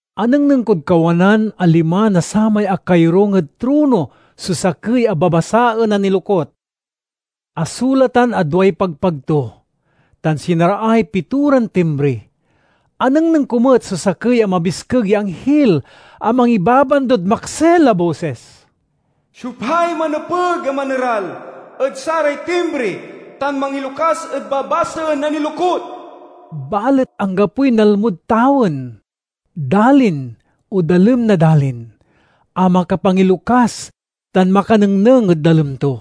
Anengneng kod kawanan a lima na samay akayorung ed trono so sakey a babasaen a nilokut. Asulatan a duay pagpag to, tan sinaraay pitoran timbri. Anengneng ko met so sakey a mabiskeg ya anghil a mangibabandod maksil a bosis, "Siopay manepeg a maneral ed saray timbri tan mangilokas ed babasaen a nilokut?" Balet anggapoy nalmod tawen, dalin, o dalem na dalin, a makapangilokas tan makanengneng ed dalem to.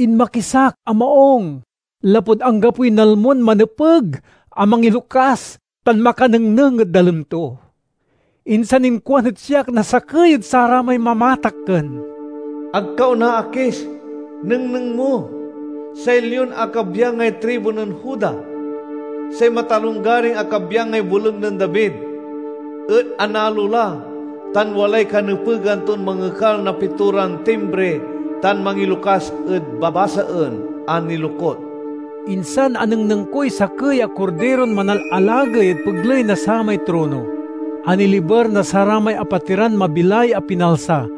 Inmakis ak a maung lapud anggapoy nalmon manepeg a mangilokas tan makanengneng ed dalem to. Insan inkuan ed siak na sakey ed saramay mamatakken: "Ag ka onaakis. Nengneng mo! Say Lion a kabyangay tribu nen Juda, say matalonggaring a kabyangay boleg nen David, et analo la tan walay kanepegan ton mangekal na pitoran timbri tan mangilokas ed babasaen a nilokut." Insan anengneng koy sakey a Kordiron manalalagey ed pegley na samay trono, a niliber na saramay apatiran mabilay a pinalsa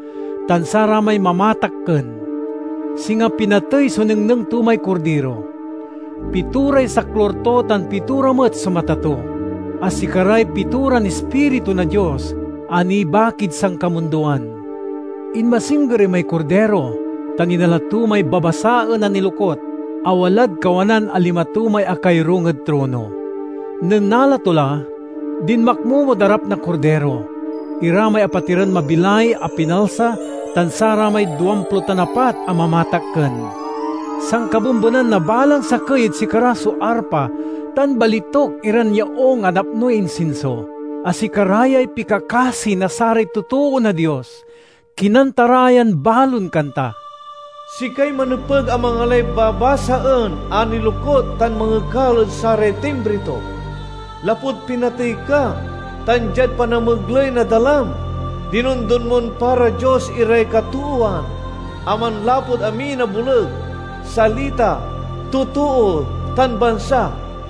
tan saramay mamatakken. Singa pinatey so nengneng to may Kordiro. Pitoray saklur to tan pitora met so mata to, a sikaray pitoran ispiritu na Dios a nibakid sankamundoan. Inmasingger imay Kordiro tan inala to may babasaen a nilokut a walad kawanan a lima to may akayorung ed trono. Nen nala to la, dinmakmomod arap na Kordiro ira may apatiran mabilay a pinalsa tan saramay duamplo tan apat a mamatakken. Sankabembenan na balang sakey ed sikara so arpa tan balituk iran yaung a napnoy insinso, a sikara yay pikakasi na saray totoo na Dios. Kinanta ra yan balon kanta: "Sikay manepeg a mangalay babasaen a nilokut tan mangekal ed saray timbri to. Lapud pinatey ka, tan diad panamegley na dalam, dinondon mon para Dios iray katoowan, a manlapud amin a boleg, salita, totoo, tan bansa.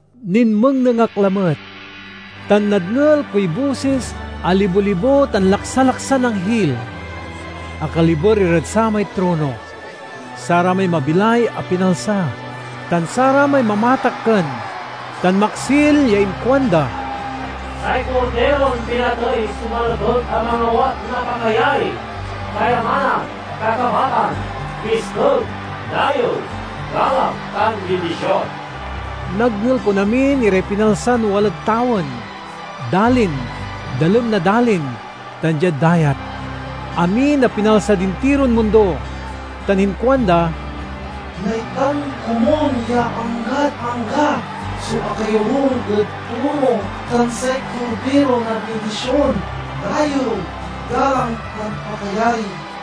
Ninmengneng ak lamet, tan nadngel koy bosis a libo-libo tan laksalaksan anghil! Akaliber irad samay trono, saramay mabilay a pinalsa, tan saramay mamatakken, tan maksil ya inkuanda, "Say Kordiron pinatey so manepeg a mangawat na pakayari, kayamanan, kakabatan, biskeg, dayew, galang, tan bindision!" Nadngel kon amin iray pinalsan walad tawen, dalin, dalem na dalin, tan diad dayat—amin a pinalsad intiron mundo—tan inkuanda, "Naitdan komun ya anggad angga so akayorung ed trono tan say Kordiro na bindision, dayew, galang, tan pakayari!"